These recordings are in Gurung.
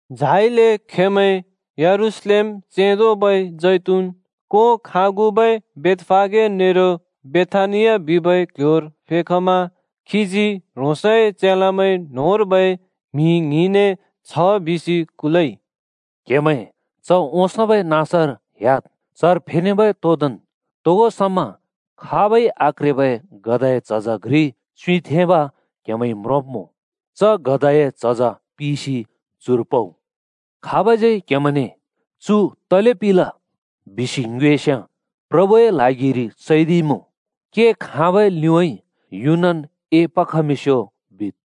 झाइले खेंमैं यरूशलेम चेंदोबै जैतून कों खागुबै बेथफागे नेरो बेथानिया बिबै क्ल्ह्‍योर फेखमा खीजी ह्रोंसए चेलामैं न्‍होंर्बै म्हि ङ्हिंने छ बिसि कुलइ, “क्हेमैं च ओंसोंबै नाँसर ह्‍याद्। चर फेनेबै तोंदोंन् तोगो समा खाबै आक्रेबै गधाए झज घ्रि च्युँइँथेंब क्हेमैंइ म्रोंब्‍मुँ, च गधाए झज पिसि चुर पउ। खाबज्यै क्हेमैंने ‘चु तले पिल?’ बिसि ङ्योएस्‍याँ, ‘प्रभुए ल्हागिर चैदिइमुँ, के खाँबै लिउँइँ यु‍नन् एपखमिंस्यो,’ बिद्।”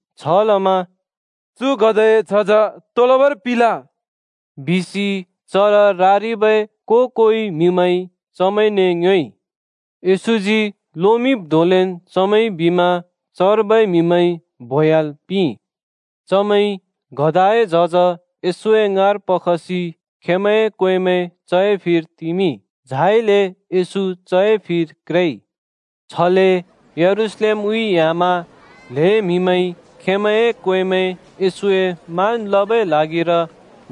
छलमा “चु गधाए झज तो लबर पिल?” बिसि चर रारिबै को-कोइ म्‍हिमैंइ चमैंने ङ्योएइ। येशूजी लोमिंब् धोंलेन् चमैंइ बिमा चर्बै म्‍हिमैंइ बोह्‍‍याल् पिंइ। चमैंइ गधाए झज येशूए ङाँर पखसि खेंमैंए क्वेंमैं चए फिर तिमिंइ, झाइले येशू चए फिर क्रेइ। छले यरूशलेमउँइँ ह्‍यामा ल्‍हें म्‍हिमैंइ खेंमैंए क्वेंमैं येशूए मान् लबै ल्हागिर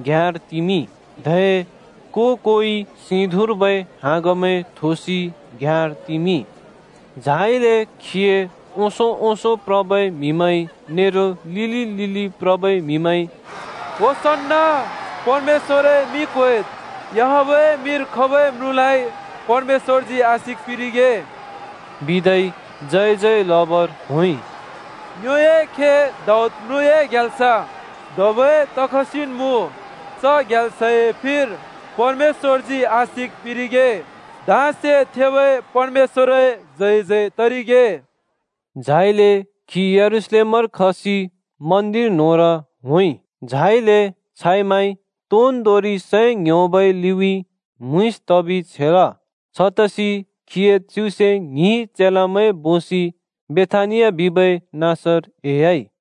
घ्‍याँर तिमिंइ, धै को-कोइ सिधुँर्बै हाँगमैं थोसि घ्‍याँर तिमिंइ। झाइले खीए ओंसों ओंसों प्रबै म्‍हिमैंइ नेरो लिलि लिलि प्रबै म्‍हिमैंइ “परमेश्‍वरए मिं क्वेद्! याहवेहए मिंर खबै म्रुँलाइ परमेश्‍वरजी आशिक पिंरिगे!” बिदै जयजय लबर होंइ। “ङ्योए खे दाऊद म्रुँए ग्याल्स धबै तखसिन् मुँ। च ग्याल्सए फिर परमेश्‍वरजी आशिक पिंरिगे! धाँसे थेबै परमेश्‍वरए जय जय तरिगे!” झाइले खी यरूशलेमर खसि मन्दिर न्‍होंर होंइ। झाइले छाइ माइ तोन्दोंरि सै ङ्‌ह्‍योबै लिउँइँ म्‍हुँइँस तबि छेल। छतसि खीए च्युसे ङ्हिं चेलामैं बोसि बेथानिया बिबै नाँसर एह्‍याइ।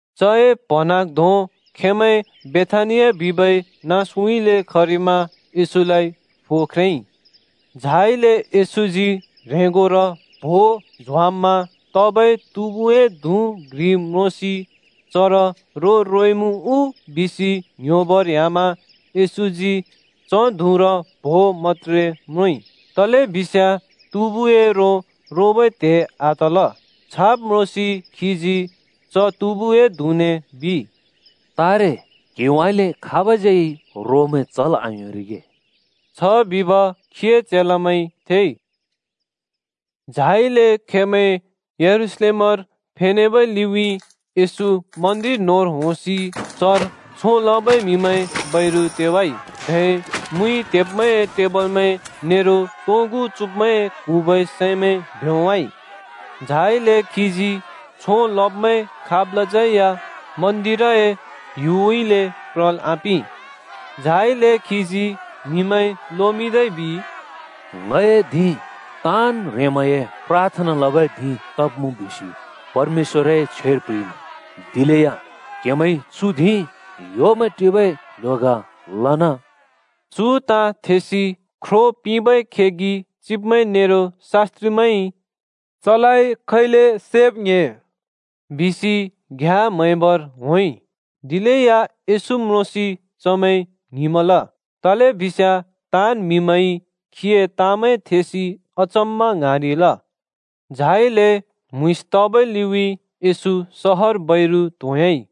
चए प्‍हँन्हाँग्धों खेंमैं बेथानिया बिबै नाँसउँइँले खरिमा येशूलाइ फो ख्रेंइ। झाइले येशूजी ह्रेंगोर प्हो झ्वाम्‍मा तबै तुँबुए धुँ घ्रि म्रोंसि चर रो रोइमुँ उ बिसि ङ्‌ह्‍योबर ह्‍यामा येशूजी च धुँर प्हो मत्‍त्रे म्रोंइ, तलेबिस्याँ तुँबुए रो रोबै त्हे आतल। छाब् म्रोंसि खीजी च तुँबुए धुँने बिइ, “तारे क्हिउँइँले खाबज्यै रोमैं चल् आयोंरिगे।” छ बिब खीए चेलामैंइ थेइ। झाइले खेंमैं यरूशलेमर फेनेबै लिउँइँ येशू मन्दिर न्होंर होंसि चर छों लबै म्‍हिमैं बैरु तेवाइ। धै मुइ त्हेब्मैंए टेबलमैं नेरो तोंगु चुँब्मैं क्हुँबै सैमैं भ्योंवाइ। झाइले खीजी छों लब्मैं खाबलाज्यै या मन्दिरए ह्‍युउँइँले प्रल् आपिं। झाइले खीजी म्‍हिमैं लोमिंदै बिइ, “ङए धिं ‘ताँन् ह्रेंमैंए प्राथना लबै धिं तब्मुँ’ बिसि परमेश्‍वरए छ्वेर प्ह्रिइमुँ: दिलेया क्‍हेमैंइ चु धिं ह्‍योमैं टिबै क्‍ल्‍ह्‍यो ग लन।” चु ताँ थेसि ख्रो पिंबै खेगि चिब्मैं नेरो शास्‍त्रिमैंइ “चलाइ खैले सैब् ङ्‍हे” बिसि घ्याँ म्हैबर होंइ, दिलेया येशू म्रोंसि चमैं ङ्हिंमल तलेबिस्याँ ताँन् म्हिमैंइ खीए ताँमैं थेसि अचम्‍मा ङ्हाँरिल। झाइले म्‍हुँइँस तबै लिउँइँ येशू सहर बैरु त्‍होंह्‍याइ।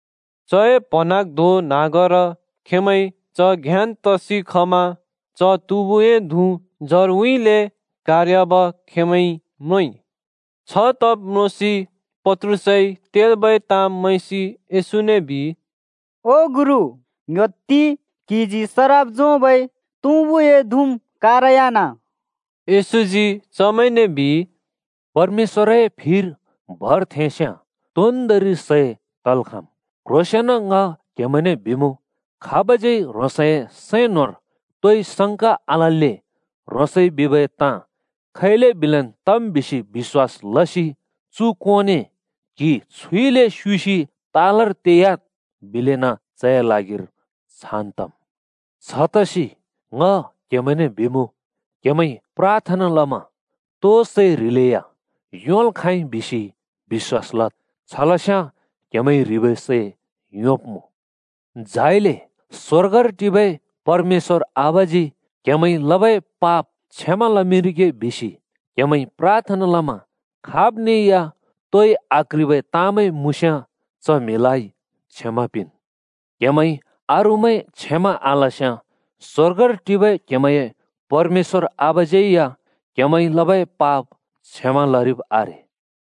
चए प्‍हँन्हाँग्धों न्‍हाँगर खेंमैं च घ्‍याँन् तसि खमा च तुँबुए धुँ जरउँइँले कारह्‍याब खेंमैंइ म्रोंइ। छतब म्रोंसि पत्रुसइ तेल्‍बै ताँ मैंसि येशूने बिइ, “ओ गुरु, ङ्‌ह्‍योत्ति, क्‍हिजी सराप झोंबै तुँबुए धुँम् कारह्‍यान।” येशूजी चमैंने बिइ, “परमेश्‍वरए फिर भर थेंस्‍याँ तोन्‍दोंरि सै तल् खाँम्। क्ह्रोंसेंन ङ क्हेमैंने बिमुँ, खाबज्यै ह्रोंसए सैं न्‍होंर तोइ संका आलल्‍ले ह्रोंसइ बिबै ताँ खैले बिलेन् तम् बिसि बिश्‍वास लसि चु कोंने ‘क्‍हि छुइले स्‍योसि तालर तेह्‍याद्,’ बिलेन चए ल्हागिर छान् तम्। छतसि ङ क्हेमैंने बिमुँ, क्‍हेमैंइ प्राथना लमा तो सै ह्रिलेया योंल् खाँइ बिसि बिश्‍वास लद्, छलस्याँ क्हेमैइ ह्रिबै सै योंब्‍मुँ। झाइले स्‍वर्गर टिबै परमेश्‍वर आबाजी क्‍हेमैंइ लबै पाप क्षमा लमिंरिगे बिसि क्‍हेमैंइ प्राथना लमा खाब्ने या तोइ आक्‍ह्रिबै ताँमैं मुँस्‍याँ च म्‍हिलाइ क्षमा पिंन्। [क्‍हेमैंइ अरूमैं क्षमा आलस्‍याँ स्‍वर्गर टिबै क्‍हेमैंए परमेश्‍वर आबाज्‍यै या क्‍हेमैंइ लबै पाप क्षमा लरिब् आरे।]”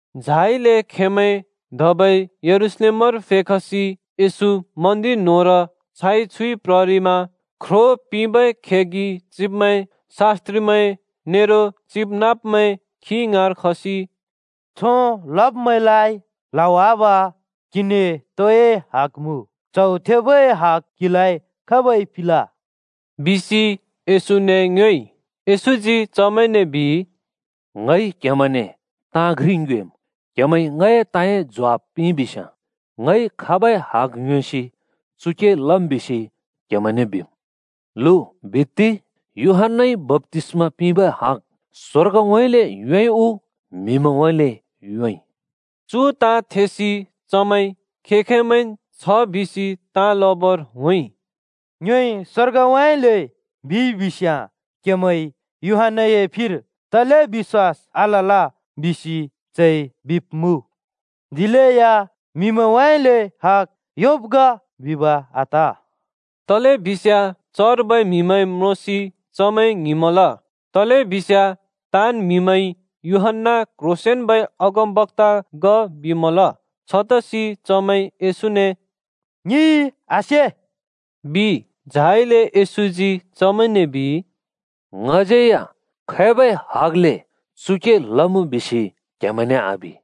झाइले खेंमैं धबै यरूशलेमर फेखसि येशू मन्दिर न्‍होंर छाइ छुइ प्ररिमा ख्रो पिंबै खेगि चिब्मैं, शास्‍त्रिमैं नेरो चिबनाँब्मैं खी ङाँर खसि “छों लब्मैंलाइ ल्हावाब क्‍हिने तोए हग मुँ? च्हौ थेबै हग क्हिलाइ खाबइ पिंल?” बिसि येशूने ङ्योएइ। येशूजी चमैंने बिइ, “ङइ क्‍हेमैंने ताँ घ्रि ङ्योएम्, क्‍हेमैंइ ङए ताँए ज्वाफ पिंइबिस्‍याँ ङइ खाबै हग योंसि चु के लम् बिसि क्‍हेमैंने बिम्। लु बित्ति, यूहन्‍नाइ बप्‍तिस्मा पिंबै हग स्‍वर्गउँइँले योंइ उ म्‍हिमैंउँइँले योंइ?” चु ताँ थेसि चमैं खें-खेंमैंन् छ बिसि ताँ लबर होंइ, “ङ्योइ ‘स्वर्गउँइँले’ बिइ बिस्‍याँ, ‘क्‍हेमैंइ यूहन्‍नाए फिर तले बिश्‍वास आलल?’ बिसि चइ बिब्‍मुँ। दिलेया ‘म्‍हिमैंउँइँले हग योंब् ग’ बिब आत!” तलेबिस्याँ चर्बै म्‍हिमैं म्रोंसि चमैं ङ्हिंमल, तलेबिस्याँ ताँन् म्हिमैंइ यूहन्‍ना क्‍ह्रोंसेंन्‍बै अगमबक्‍ता ग बिमल। छतसि चमैंइ येशूने, “ङिंइ आसे,” बिइ। झाइले येशूजी चमैंने बिइ, “ङज्‍यैया खैबै हगले चु के लमुँ बिसि क्‍हेमैंने आबि।”